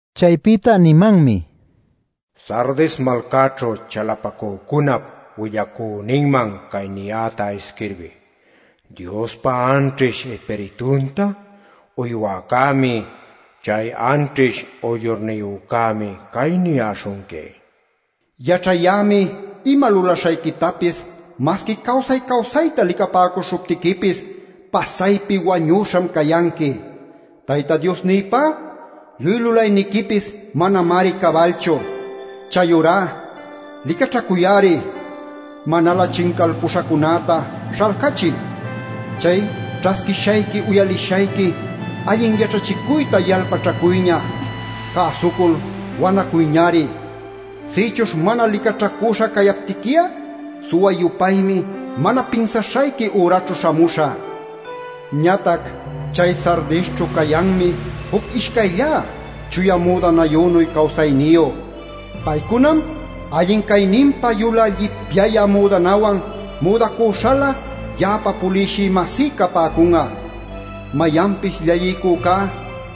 Chaypïta nimanmi: “Sardis malcaćhu chalapacücunap willacüninman cay niyäta isquirbiy: Diospa anćhish Ispiritunta uywäcämi, chay anćhish uyllurniyücämi cay niyäśhunqui: Yaćhayämi ima lulaśhayquitapis masqui cawsay-cawsayta licapäcuśhuptiquipis pasaypi wañüśham cayanqui. Tayta Diosnïpá lluy lulayniquipis manamari cabalchu. Chayurá ¡licaćhacuy-ari! Manalä chincalpuśhacunäta śhalcachiy. Chay ćhasquishayqui uyalishayqui allin yaćhachicuyta yalpaćhacuyña; cäsucul wanacuyñari. Sïchuśh mana licaćhacüśha cayaptiqui'a suwa-yupaymi mana pinsaśhayqui üraćhu śhamuśhä. Ñatac chay Sardisćhu cayanmi juc ishcayllá chuya müdanayünuy cawsayniyu. Paycunam allin cayninpa yulä llipyayä müdanawan müdacüśhalä ya'apa puliwshï-masí capäcun'a. Mayanpis llalliycücá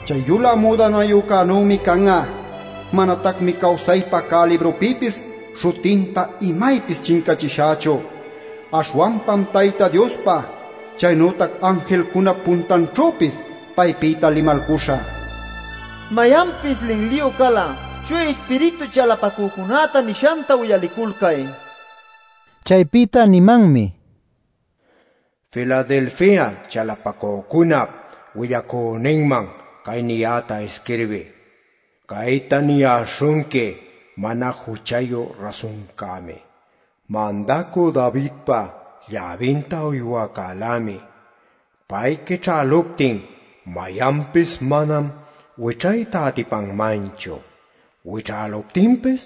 chay yulä müdanayücunänümi can'a. Manatacmi cawsaypä cä librupïpis śhutinta imaypis chincachishächu. Aśhwanpam Tayta Diospa, chaynütac anjilcunap puntanćhüpis paypïta limalcuśhä. Mayanpis linliyu cal'a Chuya Ispiritu chalapacücunäta nishanta uyaliculcay” nil. Chaypïta nimanmi: “Filadelfia chalapacücunap willacüninman cay niyäta isquirbiy: Cayta niyäśhunqui mana juchayu rasuncämi, mandacü Davidpa lläbinta uywäcälämi. Pay quićhäluptin mayanpis manam wićhayta atipanmanchu; wichäluptinpis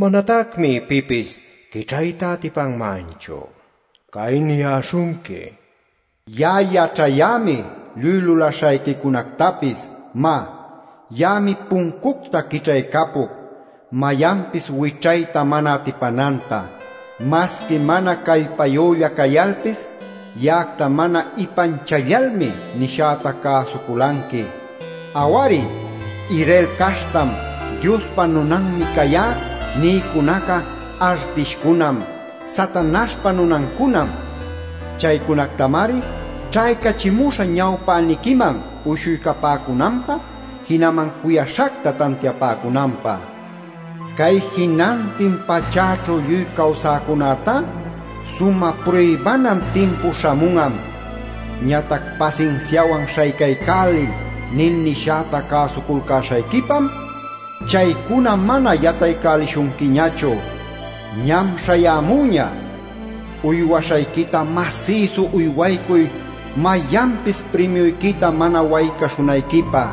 manatacmi pipis quićhayta atipanmanchu. Cay niyäśhunqui: Ya'a yaćhayämi lluy lulaśhayquicunactapis. Má, ya'ami puncucta quićhaycapuc mayanpis wićhayta mana atipananta. Masqui mana callpayülla cayalpis ya'acta mana ipanchallalmi nishäta cäsuculanqui. Aw-ari, ‘Israel caśhtam, Diospa nunanmi cayá’ nïcunaca artishcunam, Satanaśhpa nunancunam. Chaycunactamari ćhaycachimuśhä ñawpäniquiman uyshuycapämunanpä jinaman cuyaśhacta tantiapäcunanpä. Cay jinantin pachäćhu lluy cawsäcunätá sumä pruybanan timpu śhamun'am. Ñatac ‘Pasinsiawan śhaycaycäliy’ nil nishäta cäsuculcäśhayquipam chaycuna mana yataycälishunquiñachu. Ñam śhayämüña. Uywaśhayquita masïsu uywaycuy mayanpis primiuyquita mana waycaśhunayquipä.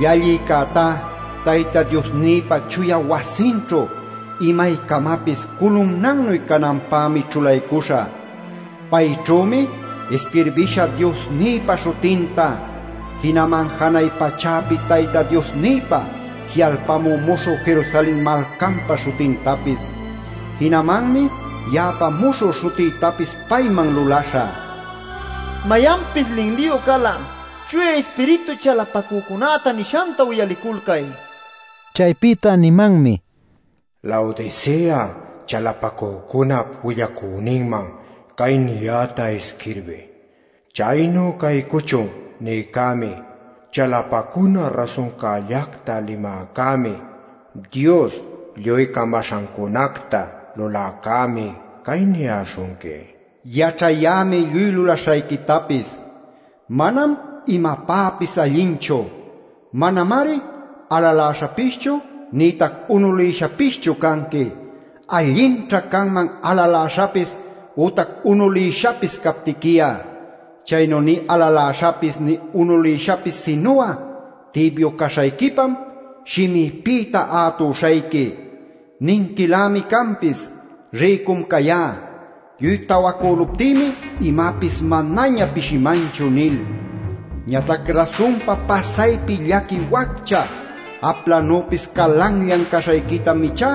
Llallïcätá Tayta Diosnïpa chuya wasinćhu imaycamapis culumnannuy cananpämi ćhulaycuśhä. Payćhümi isquirbishä Diosnïpa śhutinta, jinaman janay pachäpi Tayta Diosnïpi ji'alpamü muśhü Jerusalen malcanpa śhutintapis. Jinamanmi ya'apa muśhü śhutïtapis payman lulaśhä. Mayanpis linliyu cal'a Chuya Ispiritu chalapacücunäta nishanta uyaliculcay” nil. Chaypïta nimanmi: “Laodicea chalapacücunap willacüninman cay niyäta isquirbiy: ‘Chaynu caycuchun’ nïcämi, chalapacuna rasuncällacta limäcämi, Dios lluy camaśhancunacta luläcämi cay niyäśhunqui: Yaćhayämi lluy lulaśhayquitapis: manam imapäpis allinchu; manamari alaläśhapischu nïtac unulïshapischu canqui. ¡Allinćha canman alaläśhapis ütac unulïshapis captiqui'a! Chaynu nï alaläśhapis nï unulïshapis sinu'a tibyu caśhayquipam shimïpïta ätuśhayqui. Ninquilämi canpis: ‘Rïcum cayá; lluy tawacüluptïmi imapis manaña pishimanchu’ nil. Ñatac rasunpa pasaypi llaqui waccha, aplanüpis calanllan caśhayquitam ichá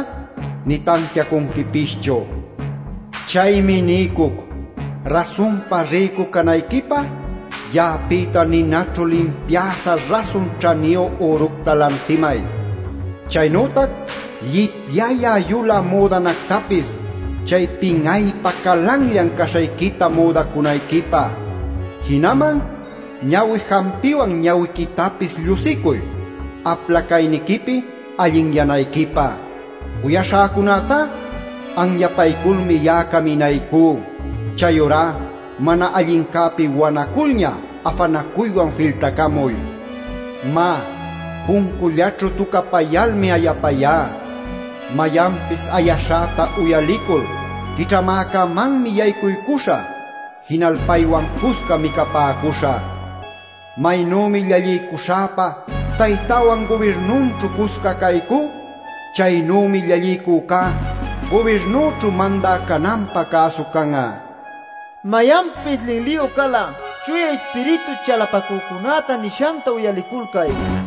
nï tantiacunquipischu. Chaymi niycuc: rasunpa rïcu canayquipä ya'apïta ninaćhu limpiäśha rasun ćhaniyu üructa lantimay, chaynütac llipyayä yulä müdanactapis chay pin'aypä calanllan caśhayquita müdacunayquipä. Jinaman ñawi jampiwan ñawiquitapis llushicuy apla cayniquipi allinyanayquipä. Cuyaśhäcunätá anyapayculmi ya'a caminaycú. Chayurá mana allincäpi wanaculña afanacuywan filtacamuy. Má, puncullaćhu tucapayalmi ayapayá. Mayanpis ayaśhäta uyalicul quićhamäcämanmi yaycuycuśhä, jinal paywan cusca micapäcuśhä. Maynümi llalliycuśhäpa Taytäwan gubirnunćhu cusca caycú, chaynümi llalliycücá gubirnüćhu mandä cananpä cäsu can'a. Mayanpis linliyu cal'a Chuya Ispiritu chalapacücunäta nishanta uyaliculcay” nil.